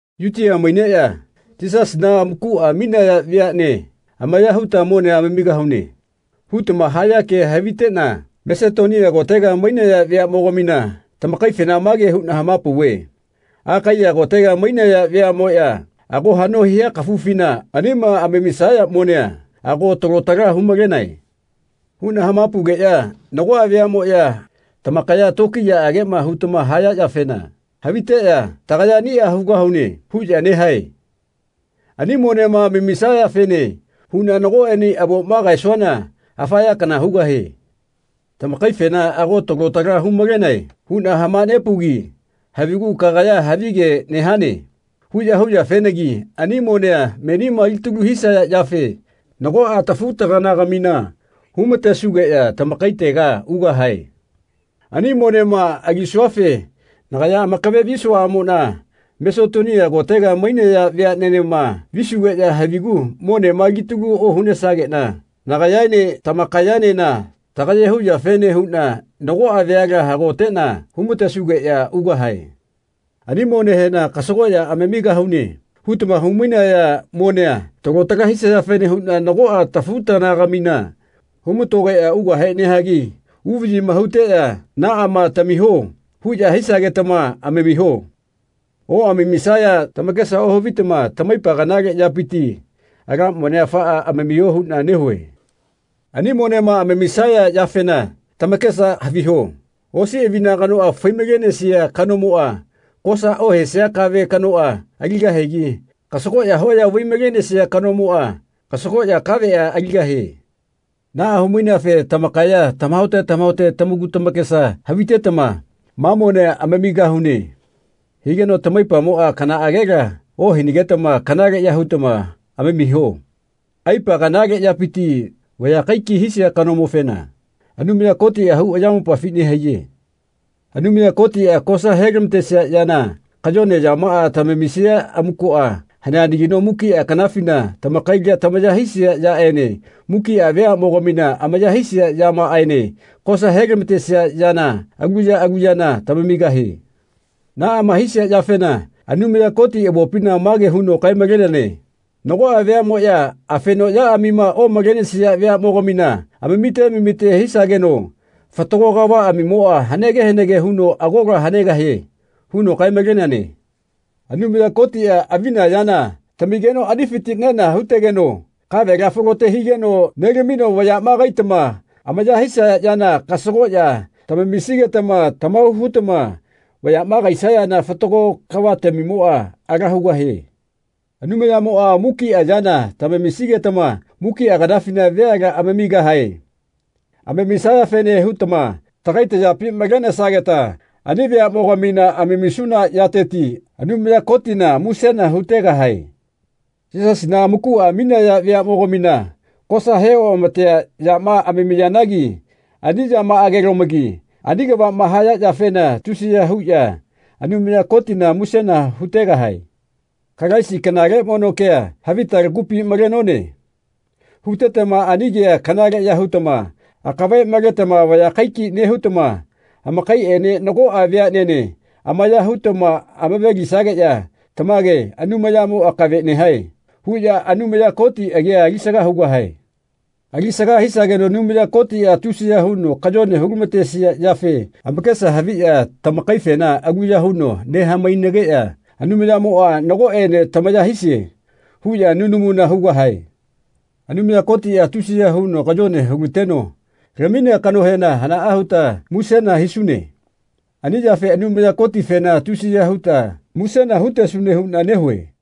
“Yutia maineꞌya Yisasina amakuꞌa aminaya veaꞌne amaya huta monea amamigahune.” hutama haya kea haviteꞌna Masetonia kotega mainaya veaꞌmogamina tamakaifena mage huꞌna hamapauve “Akaiya kotega mainaya veaꞌmoꞌya ago haꞌno hia kafufina anima amamisaya monea ago talo tala humalenae.” huꞌna hamapaugeꞌya nagoꞌa veaꞌmoꞌya tamakaya tokiyaꞌageꞌma hutama haya yafena haviteꞌya “Tagaya aniꞌa hugahune.” huꞌya nehae. Ani monema amamisayafene huꞌna nagoꞌene avoma kaesuana afa ya kana hugahie. Tamakaifena “Ago talo tala humalenae.” huꞌna hamanepaugi havigu “Kagaya havige nehane.” huꞌya huyafenagi ani monea menima alitalu hisaya yafe nagoꞌa tafu-taganagamina humatesugeꞌya tamakaitega ugahae. Ani monema alisuafe nagaya amakave visuaꞌamoꞌna Masetonia kotega mainaya veaꞌnenema visugeꞌya havigu monema alitalu ohunesageꞌna nagayaene tamakayaenena tagaye huyafene huꞌna nagoꞌa vayala hagoteꞌna humatesugeꞌya ugahae. Ani monehena “Kasagoꞌya amamigahune.” hutama humainaya monea talo tala hisayafene huꞌna nagoꞌa tafu-taganagamina humatogeꞌya ugahe nehagi uvaꞌyima huteꞌya “Naꞌama tamiho.” huꞌya hisagetama amamiho. Oꞌamamisaya tamakesa ohavitama tamaipa kanale yapiti ala monea afaꞌa amamiho huꞌna nehue. Ani monema amamisaya yafena tamakesa haviho. Osi avina kanoꞌa fai-malenesia kanomoꞌa kosa ohesia kave kanoꞌa aligahigi kasagoꞌya hoya vai-malenesia kanomoꞌa kasagoꞌya kaveꞌa aligahie. Naꞌa hu-maineafe tamakaya tamahaote tamahaote tamaku tamakesa havitetama “Ma monea amamigahune.” higeno tamaipamoꞌa kanaꞌagela ohinagetama kanaleꞌya hutama amamiho. Aipa kanale yapiti vaya kaikai hisia kanomofena Anumaya Kotiꞌa hau ayamopafi nehaiye. Anumaya Kotiꞌa kosa helamatesia yana kayone yamaꞌa tamamisia amukoꞌa haneanagino mukiꞌa kanafina tamakaila tamaya hisia yaꞌene mukiꞌa veaꞌmogamina amaya hisia yamaꞌaene kosa helamatesia yana alu ya alu yana tamamigahie. Naꞌama hisia yafena Anumaya Koti avopina mage huno kae-maleneane “Nagoꞌa veaꞌmoꞌya afeno yaꞌamima omalenesia veaꞌmogamina amamite amamite hisageno fatago kavaꞌamimoꞌa hanege hanege huno agola hanegahie.” huno kae-maleneane. Anumaya Kotiꞌa avina yana tamigeno anifiti nena hutegeno kavela falote higeno nelamino vayaꞌma kaitama amaya hisaya yana kasagoꞌya tamamisigetama tamahau hutama vayaꞌma kaisayana fatago kavatamimoꞌa ala hugahie. Anumayamoꞌa mukiꞌa yana tamamisigetama mukiꞌa kanafina veala amamigahae. Amamisayafene hutama tagai tayapi malenesageta ani veaꞌmogamina amamisuna yateti Anumaya Kotina musena hutegahae. Yisasina amakuꞌa aminaya veaꞌmogamina kosa heoꞌamatea yama amamiyanagi ani yamaꞌagelomagi ani kavaꞌma haya yafena tusiya huꞌya Anumaya Kotina musena hutegahae. “Kalaisi kanale mono kea havita lagupi malenone.” hutetama ani kea kanaleꞌya hutama akave maletama vaya kaikai nehutama amakaiꞌene nagoꞌa veaꞌnene amaya hutama amave-lisageꞌya “Tamage Anumayamo akave nehae.” huꞌya Anumaya Koti agia alisaga hugahae. Alisaga hisageno Anumaya Kotiꞌa tusiya huno kayone hulamatesia yafe amakesa haviꞌya tamakaifena aluya huno nehamainageꞌya “Anumayamoꞌa nagoꞌene tamaya hisie.” huꞌya nunamuna hugahae. Anumaya Kotiꞌa tusiya huno kayone hulateno laminea kanohena hanaꞌa huta musena hisune. Ani yafe Anumaya Kotifena tusiya huta musena hutesune huꞌna nehue.